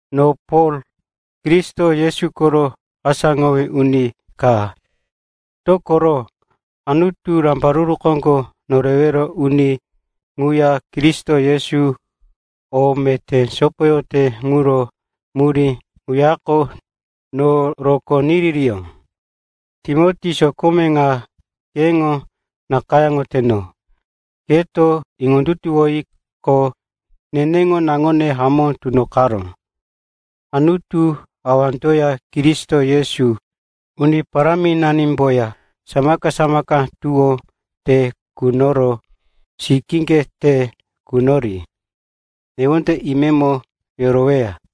No Pol, Kristo Yesu koro asáŋowí uni ka, dokoro Anutu, Rambaruru Koŋgo Norewero Uni ŋuya Kristo Yesu, o meté sopoyoteto ŋuro murí ŋuyako no rokó niririyó. Timoti, sokome ŋa keŋo nakayáŋoteno. Keto iŋondutuwiqo, neneŋo naŋone hamó tunoqaró. Anutu Awandoya Kristo Yesu, Uni Paráminanimboya samaka-samaka tuwó te kunoro, sikíŋge te kunori, newonde imemo yoroweya.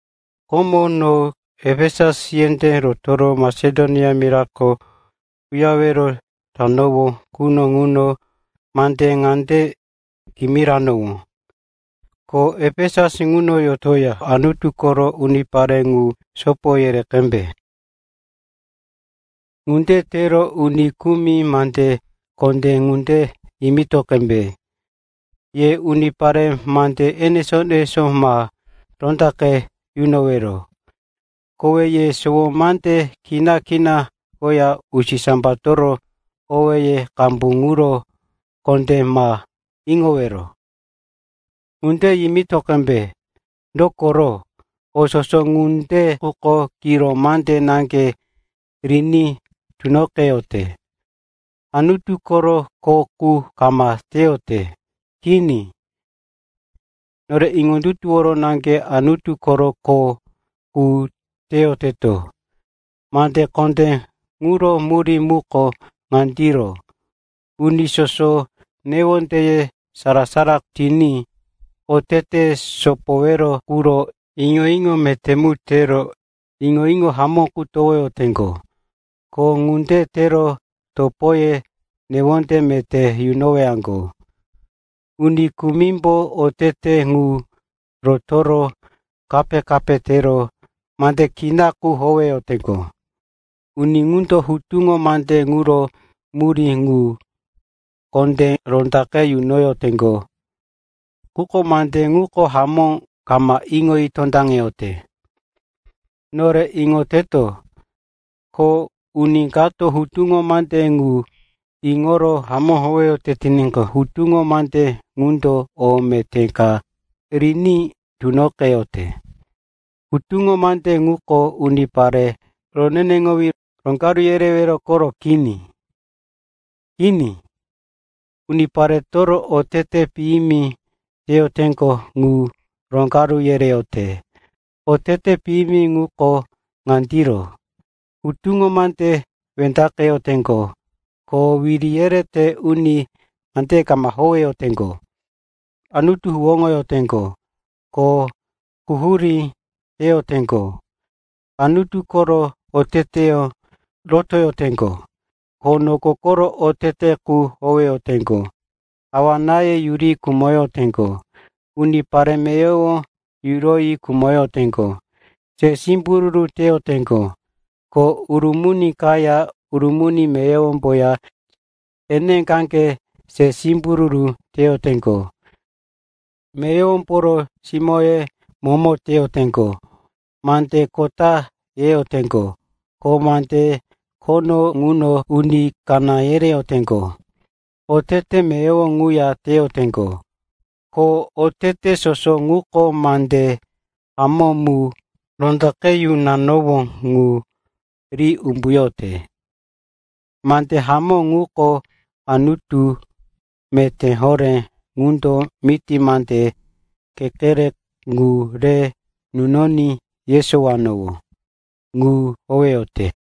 Komo, no Efesus yendé rotoro Masedonia mirako uyarewero tanowó quno ŋuno mande ŋande kimiranowó, ko Efesus ŋuno yotoya Anutu koro unipare ŋu sopo yere qembe. Ŋunde tero uni kumi mande kondé ŋande yimito qembe, “Ye unipare mande enesó-enesó ma rondaqe yunoyowero. Kowe ye sowo mande kina-kina koya usisambatoro owéye qambu ŋuro kondé ma iŋowero.” Ŋunde yimito qembe, dokoro o soso ŋunde quko kiro mande naŋge riní tunoqeyote, Anutu koro kho qu ka kama teyote. Kini, nore iŋondutuwore naŋge Anutu koro kho qu teyoteto. Mande kondé ŋuro murí muko ŋandiro, uni soso newondeye sara-sara tiní, oteteye sopowero quro iŋo-iŋo meté mu tero, iŋo-iŋo hamó qu teyowaŋgo, ko ŋunde tero topoye newonde meté yunowaŋgo. Uni kumimbo otete ŋu rotoro, kape-kape tero, mande kina qu howeyoteŋgo. Uni ŋundo hutuŋo mande ŋuro murí ŋu kondé rondaqe yunoyoteŋgo, quko mande ŋu hamó kama iŋoyi tondaŋeyote. Nore iŋoteto, ko uni kato hutuŋo mande ŋu iŋoro hamó howeyote tiníqo, hutuŋo mande ŋundo o meté ka riní tunoqeyote. Hutuŋo mande ŋuko unipare roneneŋowí roŋgaru yerewero koro kini. Kini, unipareto otete piyimi teyoteŋgo ŋu roŋgaru yereyote. Oteteye piyimi ŋuko ŋandiro: hutuŋo mande wendaqeyoteŋgo ko wiri yerete uni mandeye kama howeyoteŋgo; Anutu huwóŋoyoteŋgo ko quhurí teyoteŋgo; Anutu koro oteteyó rotoyoteŋgo ko noko koro otete qu howeyoteŋgo; awa-náye yuroyi khumoteŋgo, unipare meyowo yuroyi khumoteŋgo; se simbururu teyoteŋgo ko urumuni kaya urumuni meyowomboya eneqaŋge se simbururu teyoteŋgo; meyowomboro simóye momo teyoteŋgo; mande kota yeyoteŋgo ko mande khono ŋuno uni kaná yereyoteŋgo. Otete meyowo ŋuya teyoteŋgo, ko otete soso ŋuko mande hamó mu rondaqe yunanowó ŋu ri umbuyote. Mande hamó ŋuko Anutu meté horé ŋundo miti mande kekere ŋu re nunoní yesowanowó ŋu howeyote.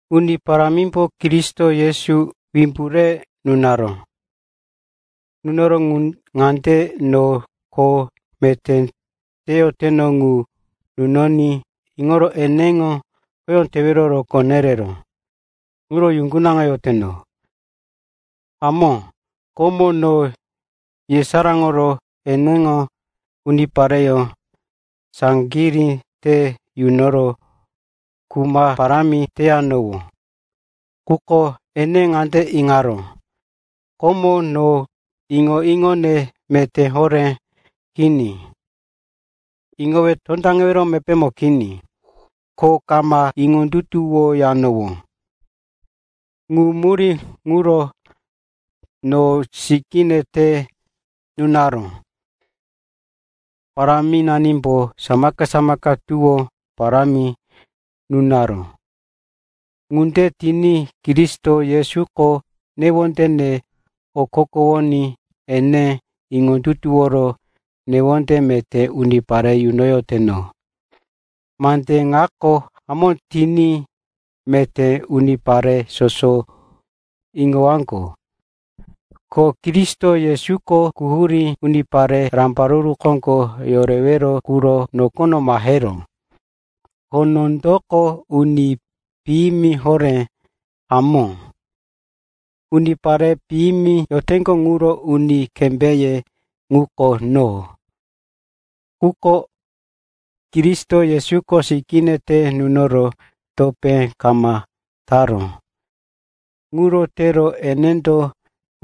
Uni Paráminani Kristo Yesu wimbu re nunaró ŋundo no kho meté teyoteno ŋu niyo iŋoro eneŋo khoyó tewero rokó nereró. Ŋuro yuŋgunaŋoyoteno. Hamó, komo no yesaráŋoro eneŋo unipareyó saŋgirí te yunoro kuma parámi teyanowó. Quko ene ŋande iŋaró, komo no iŋo-iŋone meté horé kini, iŋowe tondaŋewero mepémo kini, ko kama iŋondutuwoyanowó. Ŋu murí ŋuro no sikíne te nunaró. Paráminanimbo samaka-samaka tuwó parámi nunaró. Ŋunde tiní Kristo Yesuko newondene okokowoní ene iŋondutuworo newonde meté unipare yunoyoteno. Mande ŋako hamó tiní meté unipare soso iŋowaŋgo: ko Kristo Yesuko quhurí unipare rambaruru koŋgo yorewero quro nokono maheró. Ko nondoko uni piyimi horé; hamó, unipare piyimi yoteŋgo ŋuro uni kembé ŋuko no. Quko Kristo Yesuko sikíne te nunoro topé kama taró. Ŋuro tero enendo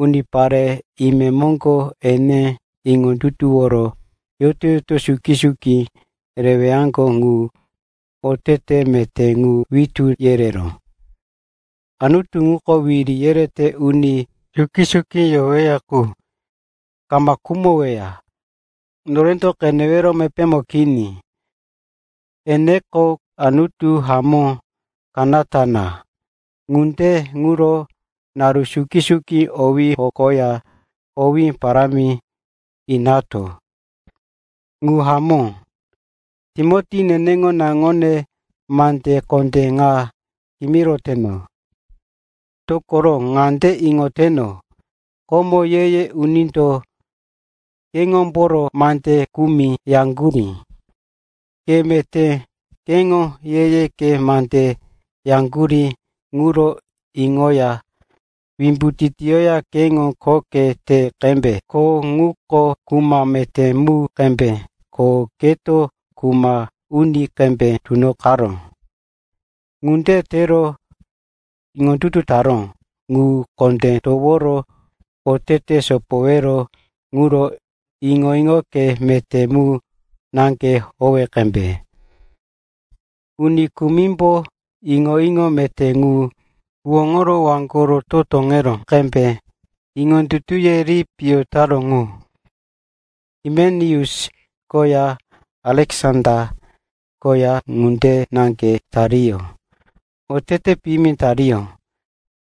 unipare imemoŋgo ene iŋondutuworo yoto-yoto suki-suki rewaŋgo ŋu otete meté ŋu witú yereró. Anutu ŋuko wiri yerete uni suki-suki yoweya qu, kama khumoweya, norendo qenewero mepémo kini. Eneko Anutu hamó kanata na. Ŋunde ŋuro naru suki-suki owí hokoya owé parámi inato. Ŋu hamó. Timoti neneŋo naŋone, mande kondé ŋa kimiroteno, dokoro ŋande iŋoteno, komo ye-ye unindo keŋomboro mande kumi yaŋgurí. Ke meté keŋo ye-ye mande yaŋgurí ŋuro iŋoya wimbu titiyoya keŋo khoke te qembe. Kho ŋuko kuma meté mu qembe, ko keto kuma uni qembe tunoqaró. Ŋunde tero iŋondutu taró ŋu kondé toworo otete sopowero quro iŋo-iŋoke meté mu naŋge howe qembe. Uni kumimbo iŋo-iŋo meté ŋu huwóŋoro waŋgoko toro puŋomo tokoŋaró qembe iŋondutuye ri piyo taró ŋu. Himeneus koya Aleksanda koya ŋunde naŋge tariyó. Otete piyimi tiriqo,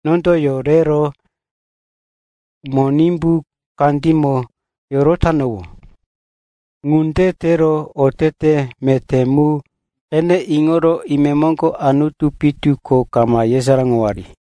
nondo yorero Monimbu kandímo yorotanowó. Ŋunde tero otete meté mu qene iŋoro imemoŋgo Anutu pitu ko kama yesaráŋowari.